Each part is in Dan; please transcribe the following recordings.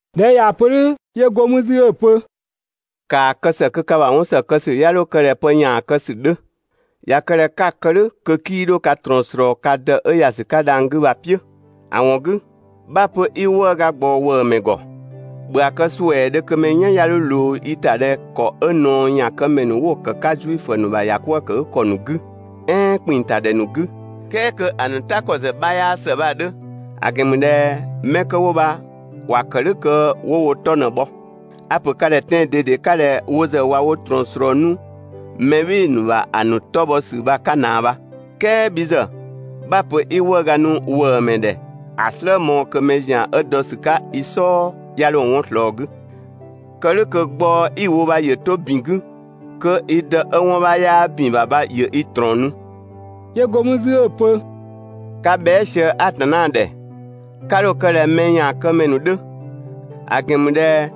꞊Dhɛ 'ö ꞊yaa‑ pö "dhʋ̈, 'yö go mü 'zü 'ö‑ pö: «‑Kaa kë ‑së kö ka ‑bha 'wɔn ‑së kë ‑sü 'ya 'dho kë ꞊dhɛ pë ‑yaan kë ‑sü 'dhö. ꞊Ya kë ꞊dhɛ 'ka‑ kë "dhʋ̈ kö 'kii 'dho ka ꞊trɔɔn yö ka Dë 'ö ‑ya ‑sü 'ka dhang‑ 'gü bha‑ "piʋ̈. ‑A ‑wɔn 'gü 'bha‑ pö bhii 'wëëga ꞊gbaɔ ‑wëëmɛ ‑gɔ, ‑bhö ‑a kë ‑suɛɛdhö kö mɛ "yan 'ya 'dho ꞊loo i ‑ta ꞊dhɛ ‑kɔ 'ö ꞊naɔyaankëmɛ ‑nu 'wo‑ kë‑ 'ka Zuifö ‑nu ‑bha ‑yakwëëkëgükɔ ‑nu 'gü, "ɛɛn ‑kpinng ‑ta ‑dhɛ ‑nu 'gü ("kɛɛ kö ‑a ‑nu "ta ‑kɔ ‑zë 'bha 'yaa ‑së) bha‑ 'dhö. ‑A ‑gɛn ‑mü ꞊dhɛ 'mɛ 'kö 'wo bha ‑wa ‑kë "dhʋ̈ kö ‑wo wo 'tɔ ꞊në‑ bhɔ. A‑ ‑pö ka ‑dhɛ tɛan‑ ꞊dede 'ka ꞊dhɛ wo ‑zë ꞊wa wo ꞊trɔɔn ꞊slɔɔ 'nu (mɛ "bhɩɩ‑ ‑nu ‑bha ‑a ‑nu 'tɔ bhɔ ‑sü bha‑ 'ka ꞊naa bha). "Kɛɛ bhi ‑zë 'bha‑ pö 'i 'wëëga nu ‑wëëmɛ ‑dhɛ ‑a "slë mɔɔ‑ kö mɛ ‑zian 'ö dɔ ‑sü 'ka i "sɔɔ 'ya 'dho 'wɔn ꞊slɔɔ‑ 'gü! Kë "dhʋ̈ kö gbaɔ‑ 'i‑ wo bha ‑yö 'to ‑bin 'gü kö i Dë 'ö 'wɔn 'bha 'yaa ‑bin ‑bha bha ‑yö i ꞊trɔɔn nu.» 'Yö go mü 'zü 'ö‑ pö: «'Ka bhɛa" sië Atanna ‑dhɛ 'ka 'dho‑ kë ꞊dhɛ mɛ ‑yaankëmɛ ‑nu 'dhö; ‑a ‑gɛn ‑mü ꞊dhɛ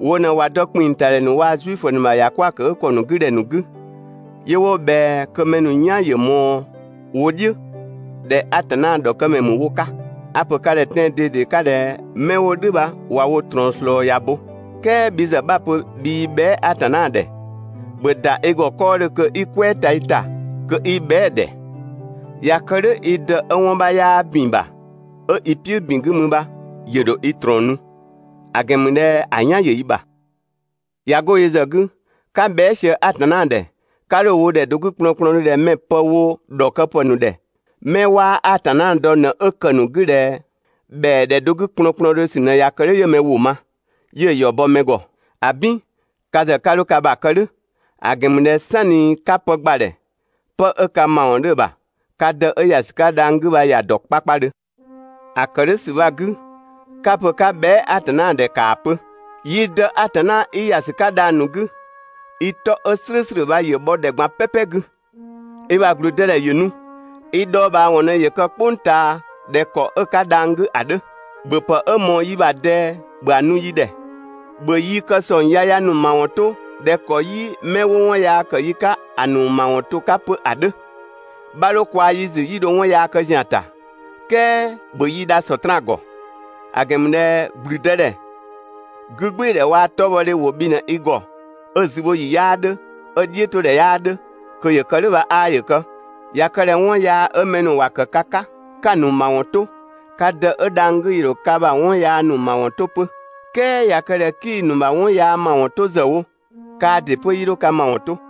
wo ꞊në ꞊wa dɔ ‑kpinng ‑ta ‑dhɛ ‑nu waa‑ Zuifö ‑nu ‑bha ‑yakwëëkëgükɔ ‑nu 'gü ‑dhɛ ‑nu 'gü, 'yö 'wo ꞊bhɛa kö mɛ ‑nu "yan ‑yö ꞊mɔɔ wo "dhiʋ̈ ꞊dhɛ Atanna ‑dhɔkëmɛ ‑mü wo 'ka. A‑ ‑pö ka ‑dhɛ tɛan‑ ꞊dede 'ka ꞊dhɛ 'mɛ 'wo "dhʋ̈ bha ꞊wa wo ꞊trɔɔn ꞊slɔɔ ‑ya bo. "Kɛɛ bhi ‑zë 'bha‑ pö bhii bhɛa" Atanna ‑dhɛ, ‑bhö ‑da i ‑gɔ 'kɔɔdhö kö 'i "kwɛɛ ta i ‑ta kö 'i bhɛa"‑ ‑dhɛ. ꞊Ya kë "dhʋ̈ i Dë 'ö 'wɔn 'bha 'yaa ‑bin ‑bha 'ö i "piʋ̈ ‑bin 'gü mü bha ‑yö ‑dho i ꞊trɔɔn nu; ‑a ‑gɛn ‑mü ꞊dhɛ ‑a "yan ‑yö i ‑bha. ꞊Ya 'go yö ‑zë 'gü, 'ka bhɛa" sië Atanna ‑dhɛ, 'ka 'dho‑ wo ‑dhɛ do 'gü kplɔnkplɔndhö ꞊dhɛ mɛ‑ pë wo ‑dhɔkëpë ‑nu ‑dhɛ mɛ 'waa Atanna dɔ ꞊në 'ö ‑kë ‑nu 'gü ꞊dhɛ ‑bhɛa ‑dhɛ do 'gü kplɔnkplɔndhö ‑sü ꞊në ꞊ya kë "dhʋ̈ 'yö mɛ ‑wʋ ma, 'yö‑ ‑yɔ ‑bɔ mɛ ‑gɔ. ‑Abin! Ka ‑zë 'ka 'dho ka ‑bha kë "dhʋ̈, ‑a ‑gɛn ‑mü ꞊dhɛ "sanni 'ka pë ‑gbadhɛ, pë 'ö ka ‑mawɔn 'dhö‑ ‑bha, ka Dë 'ö ‑ya ‑sü 'ka dhang‑ 'gü bha ‑ya ‑dɔ 'kpakpadhö. ‑A ‑kë "dhʋ̈ ‑sü bha‑ 'gü 'ka‑ pö 'ka bhɛa" Atanna ‑dhɛ ‑kaa pö: Yi Dë Atanna 'i ‑ya ‑sü 'ka dhang‑ ‑nu 'gü, i 'tɔ 'ö "slʋ̈ʋ̈slʋ̈ bha ‑yö bhɔ ‑dhɛ ꞊gban "pɛpɛ 'gü. I ‑bha ‑gblüdëdhɛ ‑yö nu, i dhɔɔbhaawɔn ꞊në ‑yö kë "kpʋng ꞊taa ꞊dhɛ ‑kɔ 'ö‑ 'ka dhang‑ 'gü ‑a 'dhö. ‑Bhöpë 'ö ꞊mɔɔ yi ‑bha ꞊dɛɛ, ‑bhö ‑a nu yi ‑dhɛ. ‑Bhö yi ‑kë ‑sɔng yaya ‑nu ‑mawɔn 'to ꞊dhɛ ‑kɔ 'yi 'mɛ 'wo 'wɔn yaa ‑kë 'pö yi 'ka ‑a ‑nu ‑mawɔn to‑ 'ka 'pö ‑a 'dhö. 'Bha 'dho kwaa‑ yi ‑zü 'ö 'yi dho 'wɔn yaa kë ‑zian ‑ta, "kɛɛ ‑bhö yi dha Sɔtraan ‑gɔ; ‑a ‑gɛn ‑mü ꞊dhɛ ‑gblüdëdhɛ, 'gügbɩɩdhɛ waa‑ 'tɔbhɔdhe ‑wo bhi ꞊në i ‑gɔ 'ö‑ zübhoyi 'yaa 'dhö, 'ö‑ "dhiʋ̈todhɛ 'yaa 'dhö. Kö ‑yö kë "dhʋ̈ bha 'aa ‑yö kë! ꞊Ya kë ꞊dhɛ 'wɔn yaa 'ö mɛ ‑nu ‑wa ‑kë ka 'ka, 'ka‑ ‑nu ‑mawɔn 'to, ka Dë 'ö dhang‑ 'gü ‑yö ‑dho ka ‑bha 'wɔn yaa ‑nu ‑mawɔn 'to 'pö. "Kɛɛ ꞊ya kë ꞊dhɛ 'kii‑ ‑nu ‑bha 'wɔn yaa ‑nu ‑mawɔn 'to ‑zë wo, kaa ‑dɩ 'pö 'yii dho ka ‑mawɔn 'to.»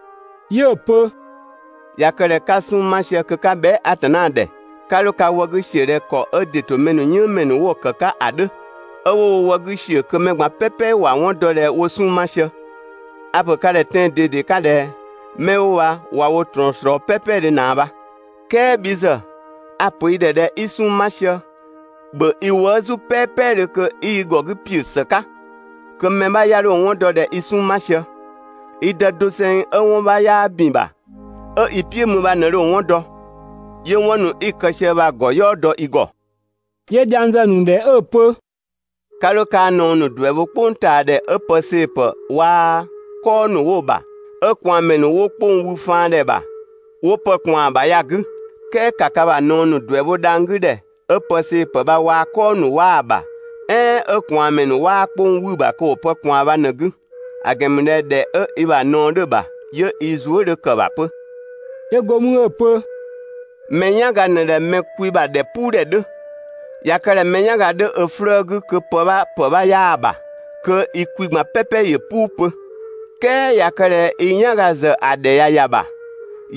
'Yö‑ pö: «꞊Ya kë ꞊dhɛ 'ka 'sunng‑ 'ma sië kö 'ka bhɛa" Atanna ‑dhɛ, 'ka 'dho ka wë 'gü ‑siö ꞊dhɛ ‑kɔ 'ö ‑dɩ ‑to mɛ ‑nu "yënngmɛ ‑nu 'wo‑ kë‑ 'ka ‑a 'dhö! 'Ö 'wo wo wë 'gü ‑siö kö mɛ ꞊gban "pɛpɛ ‑wa 'wɔn dɔ ꞊dhɛ ‑wo 'sunng‑ 'ma sië. A‑ ‑pö ka ‑dhɛ tɛan‑ ꞊dede 'ka ꞊dhɛ: 'Mɛ 'wo bha ꞊wa wo ꞊trɔɔn ꞊slɔɔ "pɛpɛdhö ꞊naa bha. "Kɛɛ bhi ‑zë, a‑ ‑pö i ‑dhɛ ꞊dhɛ i 'sunng‑ 'ma sië, ‑bhö i wëë' "zu "pɛpɛdhö kö 'i i ‑gɔ 'gü ‑piö ‑së 'ka kö mɛ 'bha 'ya 'dho‑ 'wɔn dɔ ꞊dhɛ i 'sunng‑ ma sië; i Dë doseng 'ö 'wɔn 'bha 'yaa ‑bin ‑bha, 'ö i "piʋ̈ mü bha ꞊në dho‑ 'wɔn dɔ, 'yö 'wɔn ‑nu 'i‑ kë sië bha‑ ‑gɔ "yɔɔ dɔ i ‑gɔ.» 'Yö dhiang zë‑ ‑nu ‑dhɛ 'ö‑ pö: «'Ka 'dho kaa‑ ꞊naɔ ‑nu ‑duɛ bho "kpʋngtaadhɛ 'ö pë see‑ ‑pë waa‑ "kɔɔ ‑nu 'wo‑ ‑bha, 'ö ꞊kwaanmɛ ‑nu 'wo 'kpong ‑nu wü faandhɛ bha, 'wo pë ꞊kwaan‑ ‑bha ya‑ 'gü. "Kɛɛ ‑ka ka ‑bha ꞊naɔ ‑nu ‑duɛ bho dhang‑ 'gü ‑dhɛ, 'ö pë see‑ ‑pë bha waa‑ "kɔɔ ‑nu 'waa‑ ‑bha, "ɛɛn 'ö ꞊kwaanmɛ ‑nu 'waa 'kpong 'wü‑ ‑bha kö ‑wo pë ꞊kwaan bha ꞊në‑ 'gü! ‑A ‑gɛn ‑mü ꞊dhɛ ‑dhɛ 'ö i ‑bha ꞊naɔ 'dhö‑ ‑bha, 'yö i zuë" 'dhö ‑kë ‑bha 'pö.» 'Yö go mü 'ö‑ pö: «Mɛ "yanga ꞊në ꞊dhɛ mɛ kwi ‑bha ‑dhɛpuudhɛ 'dhö. ꞊Ya kë ꞊dhɛ mɛ "yanga 'dhö ö 'flëë‑ 'gü kö pë 'bha ‑pë 'bha 'yaa‑ ‑bha, kö i kwi ꞊gban "pɛpɛ ‑yö "puu 'pö. "Kɛɛ ꞊ya kë ꞊dhɛ i "yanga ‑zë ‑a ‑dhɛ ꞊ya ‑ya ‑bha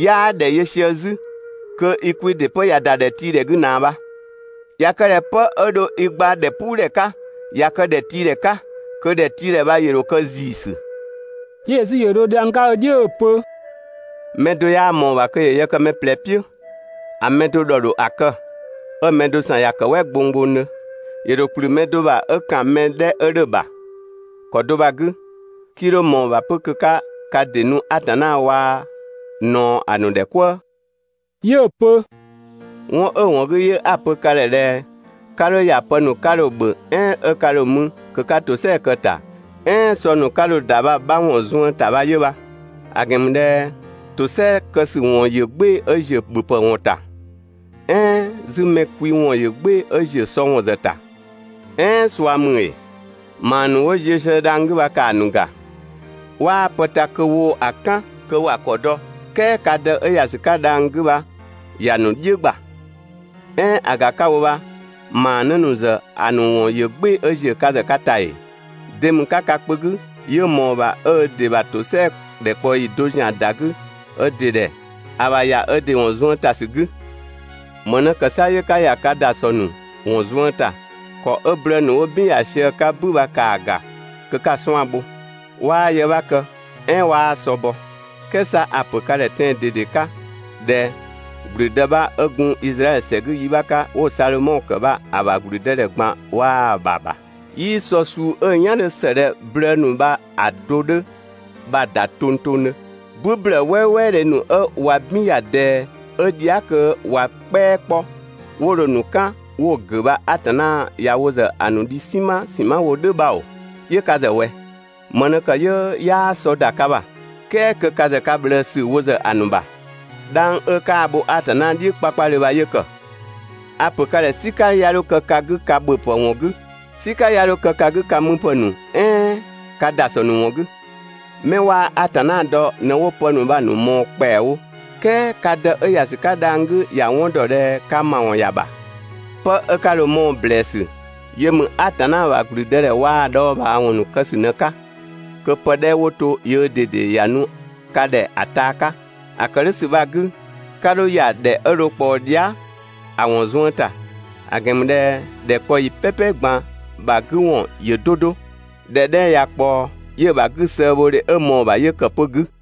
'yaa ‑dhɛ yö sië 'zü, kö i kwi ‑dɩ 'pö ꞊ya ‑da ‑dhɛ tii 'gü ꞊naa bha. ꞊Ya kë ꞊dhɛ 'pë 'ö dho i gba ‑dhɛpuudhɛ 'ka, ꞊ya kë ‑dhɛtiidhɛ 'ka, kö ‑dhɛtiidhɛ bha ‑yö ‑dho kë ‑ziisü.» 'Yö Yesu ‑yö dho dhiang 'ka ö "dhiʋ̈ 'ö‑ pö: «Mɛ do 'yaa ꞊mɔɔ‑ ‑bha kö ‑yö yë kë mɛ ꞊plɛ "piʋ̈. ‑A mɛ do ‑dhɔ ‑dho ‑a kë, 'ö‑ mɛ do ‑san ‑ya ‑kë "wɛ gbonggbongdhö. ‑Yö ‑dho ‑kplü mɛ do ‑bha 'ö ‑kan mɛ 'dhɛ 'ö 'dhö‑ ‑bha, ‑kɔ do bha‑ 'gü, 'kii 'dho ꞊mɔɔ‑ ‑bha 'pö kö 'ka ka ‑dɩ nu Atanna waa‑ ꞊naɔ ‑a ‑nu ‑dhɛ "kwëë. 'Yö‑ pö: «'Wɔn 'ö‑ ‑wɔn 'gü 'yö 'a‑ pö ka ‑dhɛ ꞊dhɛ: 'Ka 'dho ‑ya pë ‑nu 'ka dho‑ ‑bhö "ɛɛn 'ö 'ka dho‑ mü kö 'ka ‑tosɛa kë‑ ‑ta, "ɛɛn sɔ ‑nu 'ka dho‑ ‑da bha‑ 'bha ‑wɔn zuën ‑ta bha 'yö bha; ‑a ‑gɛn ‑mü ꞊dhɛ ‑tosɛa kë ‑sü ‑wɔn ‑yö "gbɩɩ‑ 'ö‑ ‑ziö ‑bhöpë ‑wɔn ‑ta, "ɛɛn 'zü mɛ kwi ‑wɔn ‑yö "gbɩɩ‑ 'ö ‑ziö sɔ ‑wɔn ‑zë ‑ta, "ɛɛn ꞊sua ‑mü ‑ee? ‑Maa ‑nu 'wo ziö sië dhang‑ 'gü bha ‑kaa ‑nu ‑ga! 'Waa pë ta kö woo‑ ‑a "kan kö ‑wa ‑kɔ dɔ, "kɛɛ ka Dë 'ö ‑ya ‑sü 'ka dhang‑ 'gü bha ‑ya ‑nu "dhiʋ̈ ‑gba. "Ɛɛn ‑a ‑ga 'ka‑ wo bha ‑maanë ‑nu ‑zë ‑a ‑nu ‑wɔn ‑yö "gbɩɩ‑ 'ö ‑ziö ka ‑zë ka ‑ta ‑ee? De ‑mü 'ka ka kpö 'gü 'yö ꞊mɔɔ‑ ‑bha 'ö ö ‑dɩ ‑bha ‑tosɛa ‑dhɛkpaɔyi do ‑zian ‑da 'gü ö ‑dɩ ‑dhɛ ‑a ‑bha ‑ya ö ‑dɩ ‑wɔn zuën ‑ta ‑sü 'gü? ‑Më ꞊në ‑kë 'sa 'yö 'ka ‑ya ka ‑dasɔ ‑nu ‑wɔn zuën ‑ta? ‑Kɔ 'ö blëë ‑nu 'wo "bin ‑ya sië‑ 'ka "bü bha ‑kaa ‑ga kö 'ka‑ 'suan‑ bho! 'Waa yë 'bha kë "ɛɛn 'waa sɔ bɔ. "Kɛɛ 'sa a‑ ‑pö ka ‑dhɛ tɛan‑ 'ka ꞊dhɛ ‑gblüdë 'bha 'ö gun Izraɛdhö ‑sɛ 'gü yi 'bha 'ka 'wo‑ Sadhomɔ ‑kë bha‑ ‑bha ‑gblüdëdhɛ ꞊gban waa‑ ‑bha ‑bha, 'yii sɔ suu 'ö‑ "yan 'dhö ‑së ꞊dhɛ blëë ‑nu bha‑ do 'dhö bha‑ ‑da tongtongdhö. "Bü ‑blëë "wɛɛwɛɛ dhe ‑nu 'ö ꞊wa "bin ‑ya ꞊dɛɛ 'ö dhia" kö ꞊wa "kpɛa 'kpɔ 'wo dho‑ ‑nu "kan 'wo‑ ‑gʋ̈ bha Atanna ꞊ya wo ‑zë ‑a ‑nu dhi "sinma ‑sinma wo "dhʋ̈ bha ‑oo, 'yö ka ‑zë ꞊wɛ? ‑Më ꞊në ‑kë 'yö 'yaa sɔ ‑da ka ‑bha ("kɛɛ kö ka ‑zë ka ꞊bhlëësü wo ‑zë ‑a ‑nu ‑bha)? 'Dhang 'ö kaa‑ bho Atanna "dhiʋ̈ 'kpakpadhö bha 'yö ‑kë! A‑ ‑pö ka ‑dhɛ "sika 'ya 'dho kë ka 'gü ka ‑bhöpë ‑wɔn 'gü; "sika 'ya 'dho kë ka 'gü ka müpë ‑nu "ɛɛn ka ‑dasɔ ‑nu ‑wɔn 'gü, 'mɛ 'waa Atanna dɔ ꞊në 'wo pë ‑nu bha‑ ‑nu ꞊mɔɔ‑ ‑kpɛawo, "kɛɛ ka Dë 'ö ‑ya ‑sü 'ka dhang‑ 'gü ‑ya 'wɔn ‑dɔ ꞊dhɛ ka ‑mawɔn ‑ya ‑bha. 'Pë 'ö 'ka dho‑ ꞊mɔɔ‑ ‑blɛɛsü yö ‑mü Atanna ‑bha ‑gblüdëdhɛ waa‑ ‑a dhɔɔbhaawɔn ‑nu kë ‑sü ꞊në‑ 'ka kö pë 'dhɛ 'wo to yöö ꞊dede ‑ya nu ka ‑dhɛ ‑a taa 'ka. ‑A ‑kë "dhʋ̈ ‑sü bha‑ 'gü, 'ka 'dho ‑ya ‑dhɛ 'ö dho ꞊kpaɔ dhia" ‑a ‑wɔn zuën ‑ta, ‑a ‑gɛn ‑mü ꞊dhɛ ‑dhɛkpaɔyi "pɛpɛ ꞊gban ‑bha 'gü ‑wɔn ‑yö 'do 'do. ‑Dhɛ 'dhɛ ꞊ya ꞊kpaɔ 'yö‑ ‑bha 'gü sëëbhodhe 'ö ꞊mɔɔ‑ ‑bha 'yö ‑kë 'pö‑ 'gü.